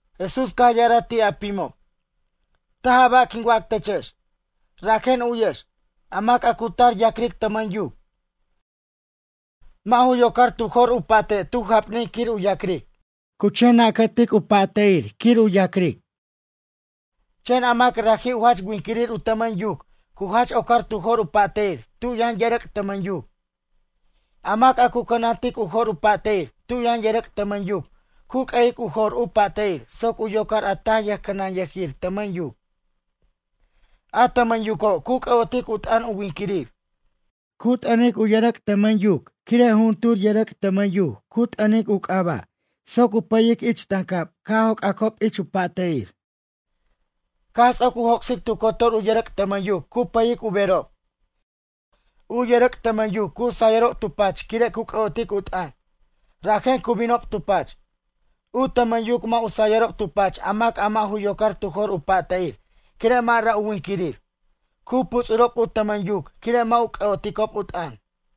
Jesús caj ya'araj ti' a pimob: ―Taj a ba' quin wac techex. Rajen u'yex, a mac a cu tar ya'cric tʌmʌn yuc, mʌ' ju yocar tu jor u pa'te' tu jap'nin quir u ya'cric. Cu chen nacatic u pa'te'ir quir u ya'cric. Chen a mac raji' u jach winquirir u tʌmʌn yuc cu jach ocar tu jor u pa'te'ir tu' yʌn yʌrʌc' tʌmʌn yuc. A mac a cu cʌnantic u jor u pa'te'ir tu' yʌn yʌrʌc' tʌmʌn yuc cu q'ue'ic u jor u pa'te'ir soc u yocar a taj yʌjcʌnanyʌjir tʌmʌn yuc. A tʌmʌn yuco' cu c'ʌ'otic u t'ʌn u winquirir. Cu t'ʌnic u yʌrʌc' tʌmʌn yuc quire' jujuntur yʌrʌc' tʌmʌn yuc cu t'ʌnic u c'aba' soc u pʌyic ich tancab ca' joc'acob ich u pa'te'ir. Caj ts'oc u joc'sic tu cotor u yʌrʌc' tʌmʌn yuc cu pʌyic u berob. U yʌrʌc' tʌmʌn yuc cu sayʌrob tu pach quire' cu c'ʌ'oticob u t'ʌn, rajen cu binob tu pach. U tʌmʌn yuc mʌ' u sayʌrob tu pach a mac a mʌ' u yocar tu jor u pa'te'ir quire' mʌ' ra' u winquirir. Cu puts'urob u tʌmʌn yuc quire' mʌ' u c'ʌ'oticob u t'ʌn.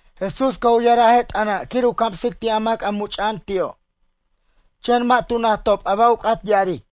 Jesús caj u ya'araj a je' t'ʌna' quir u camsic ti' a mac a mucha'an ti'o'. Chen mʌ' tu najtob a ba' u c'at ya'aric.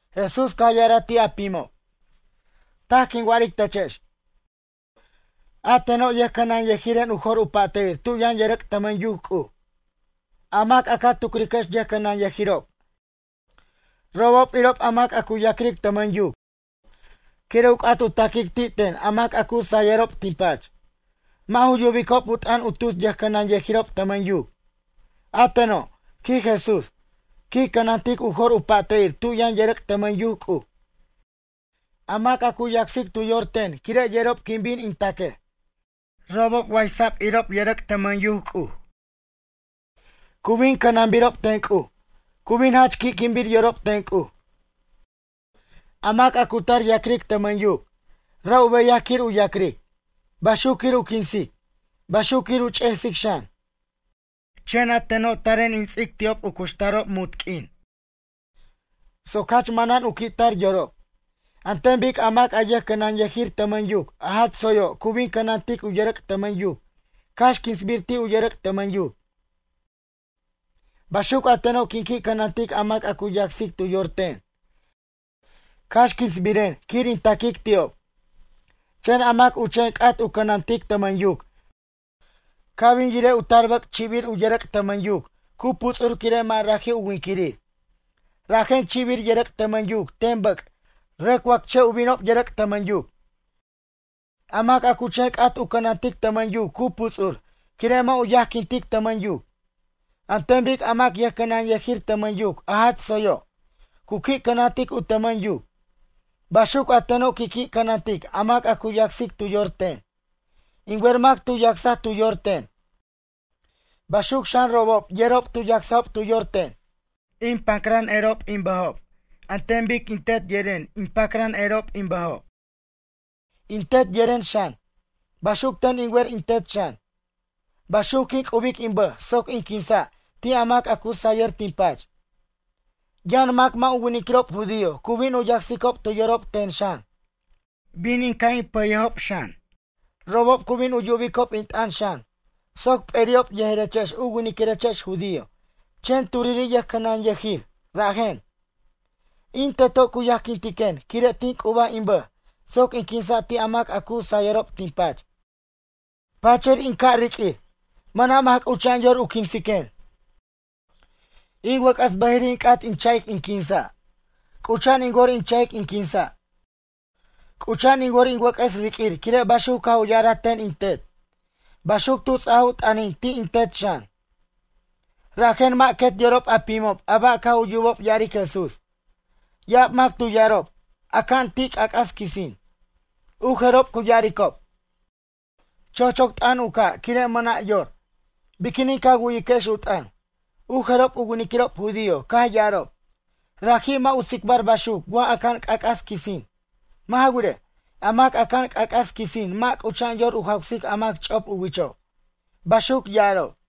Jesús caj ya'araj ti' a pimob: ―Taj quin wa'aric techex, a teno' yʌjcʌnanyʌjiren u jor u pa'te'ir tu' yʌn yʌrʌc' tʌmʌn yuc C'uj. A mac a ca tucriquex yʌjcʌnanyʌjirob, robob irob a mac a cu ya'cric tʌmʌn yuc quire' u c'at u taquic ti' ten a mac a cu sayʌrob tin pach. Mʌ' ju yubicob u t'ʌn u tus ʌjcʌnanyʌjirob tʌmʌn yuc. A teno' ―quij Jesús―, quin cʌnantic u jor u pa'te'ir tu' yʌn yʌrʌc' tʌmʌn yuc C'uj. A mac a cu yacsic tu yor ten quire' yerob quin bin in taquej. Robob waysa'b irob yʌrʌc' tʌmʌn yuc C'uj. Cu bin cʌnanbirob ten C'uj, cu bin jach qui'quinbir yorob ten C'uj. ’A mac a cu tar ya'cric tʌmʌn yuc, ra' u beyaj quir u ya'cric. Baxuc quir u quinsic. Baxuc quir u ch'esic xan. Chen a teno' taren in ts'ic ti'ob u cuxtarob munt q'uin soc jach manan u qui' tar yorob. An ten bic a mac yʌjcʌnanyijir tʌmʌn yuc a jach tsoyo' cu qui' cʌnantic u yʌrʌc' tʌmʌn yuc cax quinsbir ti' u yʌrʌc' tʌmʌn yuc. Baxuc a teno' quin qui' cʌnantic mac a cu yacsic tu yor ten cax quinsbiren quir in taquic ti'ob. Chen a mac u chen c'at u cʌnantic tʌmʌn yuc ca' bin yirej u tar bʌc' chi'bir u yʌrʌc' tʌmʌn yuc cu puts'ur quire' mʌ' raji' u winquirir. Rajen chi'bir yʌrʌc' tʌmʌn yuc ten bʌc' rʌc wacche' u binob yʌrʌc' tʌmʌn yuc. A mac a cu chen c'at u cʌnantic tʌmʌn yuc cu puts'ur quire' mʌ' u yajquintic tʌmʌn yuc. An ten bic a mac yʌjcʌnanyʌjir tʌmʌn yuc a jach tsoyo'. Cu qui' cʌnantic u tʌmʌn yuc. Baxuc a teno' quin qui' cʌnantic a mac a cu yacsic tu yor ten. In wer mac tu yacsaj tu yor ten. Baxuc xan robob yerob tu yacsajob tu yor ten. In pacran erob in bʌjob an ten bic in Tet yeren in pacran erob in bʌjob. In Tet yeren xan, baxuc ten in wer in Tet xan. Baxuc quin c'ubic in bʌj soc in quinsa' ti' a mac a cu sayʌr tin pach. Yʌn mac mʌ' u winiquirob judío cu bin u yacsicob tu yorob ten xan. Bin in ca' in pʌyejob xan. Robob cu bin u yubicob in t'ʌn xan soc p'eri'ob yejerechex u winiquirechex judío chen turiri' yʌjcʌnanyʌjir, raji'en. ’In Teto' cu yajquintiquen quire' tin c'ubaj in bʌj soc in quinsa' ti' a mac a cu sayʌrob tin pach. Pachir in ca' riq'uir. Mʌna' mac c'ucha'an yor u quinsiquen. In wʌc'ʌs bʌjiri' in c'at in cha'ic in quinsa'. C'ucha'an in wor in cha'ic in quinsa'. C'ucha'an in wor in wʌc'ʌs riq'uir quire' baxuc caj u ya'araj ten in Tet. Baxuc tu ts'aj u t'ʌnin ti' in Tet xan. Rajen mʌ' quet yorob a pimob a ba' caj u yubob ya'aric Jesús. Ya'ab mac tu ya'arob: ―Aca'an ti' c'ac'as quisin. U jerob cu ya'aricob: ―Chochoc t'ʌn u ca' quire' mʌna' yor. Biquinin ca wu'yiquex u t'ʌn? U jerob u winiquirob judío caj ya'arob: ―Raji' mʌ' u tsicbar baxuc wa aca'an c'ac'as quisin. Mʌ' ja wirej, a mac aca'an c'ac'as quisin mʌ' c'ucha'an yor u jawsic a mac ch'op u wicho' ―baxuc ya'arob.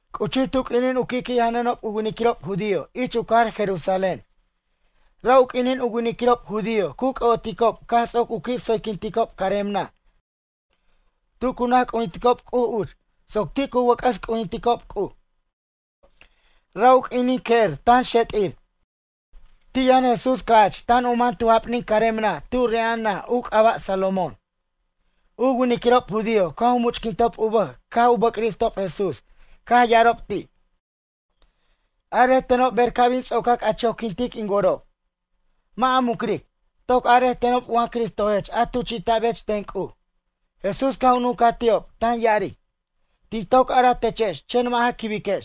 C'uchij tu q'uinin u qui'qui' janʌnob u winiquirob judío ich u cajar Jerusalén. Ra' u q'uinin u winiquirob judío cu c'ʌ'oticob caj ts'oc u qui' tsoyquinticob carem naj tu cu naj c'ujinticob C'uj uch soc ti' cu wʌc'ʌs c'ujinticob C'uj. Ra' u q'uinin que'er tan xet'ir. Ti' yʌn Jesús ca'ch tan u man tu jap'nin carem naj tu re'ja'an naj u c'aba' Salomón. U winiquirob judío caj u much'quintob u bʌj caj u bʌ'cristob Jesús caj ya'arob ti': ―Arej tenob ber ca' bin ts'ocac a choquintic in worob. Mʌ' a mucric, toc arej tenob wa Cristojech a tuchi'ta'bech ten C'uj. Jesús caj u nuncaj ti'ob tan ya'aric: ―Tin toc araj techex chen mʌ' ja quibiquex.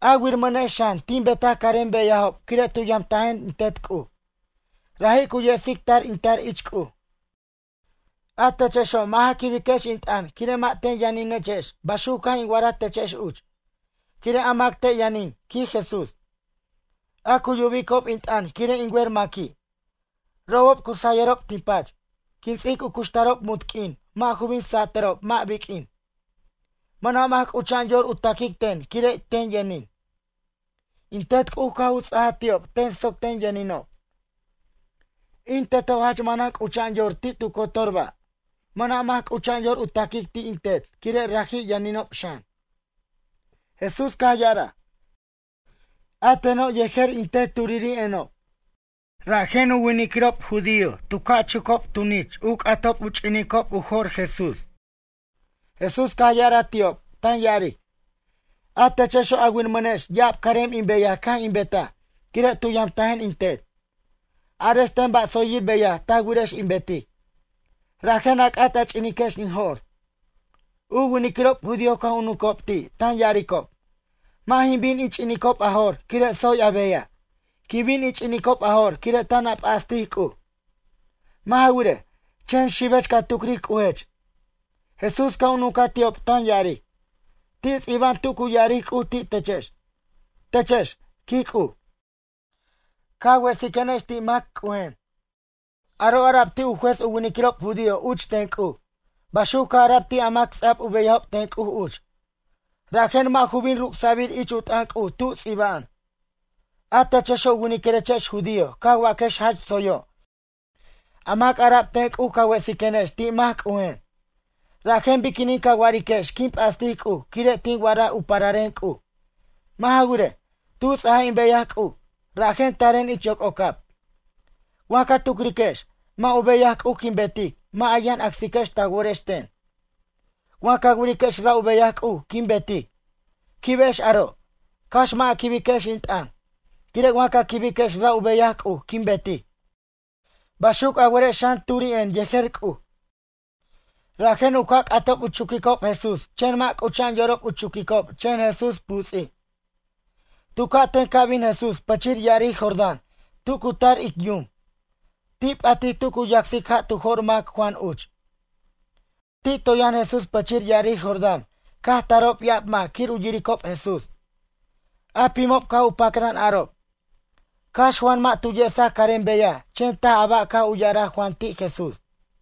A wiramʌnex xan tin betaj carem beyajob quire' tu yamtajen in Tet C'uj. Raji' cu yesic tar in tar ich C'uj. A techexo' mʌ' ja quibiquex in t'ʌn quire' mʌ' ten yʌninechex baxuc caj in wa'araj techex uch. Quire' a mac ten yʌnin ―quij Jesús―, a cu yubicob in t'ʌn quire' in wer maqui'. Robob cu sayʌrob tin pach. Quin ts'ic u cuxtarob munt q'uin mʌ' ju bin satʌrob mʌ' biq'uin. Mʌna' mac c'ucha'an yor u taquic ten quire' ten yʌnin. In Tet C'uj caj u ts'aj ti'ob ten soc ten yʌninob. In Teto' jach manan c'ucha'an yor ti' tu cotor ba'. Mʌna' mac c'ucha'an yor u taquic ti' in Tet quire' raji' yʌninob xan. Jesús caj ya'araj: ―A teno' yejer in Tet turiri'enob. Rajen u winiquirob judío tu ca' chucob tunich u c'atob u ch'inicob u jo'r Jesús. Jesús caj ya'araj ti'ob tan ya'aric: ―A techexo' a wiramʌnex ya'ab carem in beyaj caj in betaj quire' tu yamtajen in Tet. Arex ten ba' tsoyir beyaj ta wirex in betic. Rajen a c'at a ch'iniquex in jo'r. U winiquirob judío caj u nuncob ti' tan ya'aricob: ―Mʌ' jin bin in ch'inicob a jo'r quire' tsoy a beyaj. Quin bin in ch'inicob a jo'r quire' tan a p'astic C'uj. Mʌ' ja wirej, chen xibech ca tucric C'ujech. Jesús caj u nuncaj ti'ob tan ya'aric: ―Ti' ts'iba'an tu cu ya'aric C'uj ti' techex: “Techex, quij C'uj, ca wesiquenex ti' mac C'ujen.” Aro' ara'b ti' u juez u winiquirob judío uch ten C'uj. Baxuc caj ara'b ti' a mac ts'ab u beyajob ten C'uj uch. Rajen mʌ' ju bin ruc'sa'bir ich u t'ʌn C'uj tu ts'iba'an. A techexo' u winiquirechex judío ca waquex jach tsoyo' a mac ara'b ten C'uj ca wesiquenex ti' mac C'ujen. Rajen biquinin ca wa'ariquex quin p'astic C'uj quire' tin wa'araj u pararen C'uj. Mʌ' ja wirej, tu ts'aj in beyaj C'uj, rajen taren ich yoc'ocab. Wa ca tucriquex, mʌ' u beyaj C'uj quin betic mʌ' a yʌn acsiquex ta worex ten. Wa ca wiriquex ra' u beyaj C'uj quin betic, quibex aro', cax mʌ' a quibiquex in t'ʌn. Quire' wa ca quibiquex ra' u beyaj C'uj quin betic, baxuc a werex xan turi'en yejer C'uj. Rajen u ca' c'atob u chuquicob Jesús chen mʌ' c'ucha'an yorob u chuquicob chen Jesús puts'ij. Tu ca'ten ca' bin Jesús pichir ya'arir Jordán tu cu tar ic yum, ti' p'atij tu cu yacsic ja' tu jo'r mac Juan uch. Ti' toy yʌn Jesús pʌchir ya'arir Jordán caj tarob ya'ab mac quir u yirirob Jesús. A pimob caj u pacran arob: ―Cax Juan mʌ' tu yesaj carem beyaj chen taj a ba' caj u ya'araj Juan ti' Jesús.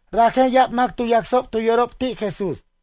Rajen ya'ab mac tu yacsob tu yorob ti' Jesús.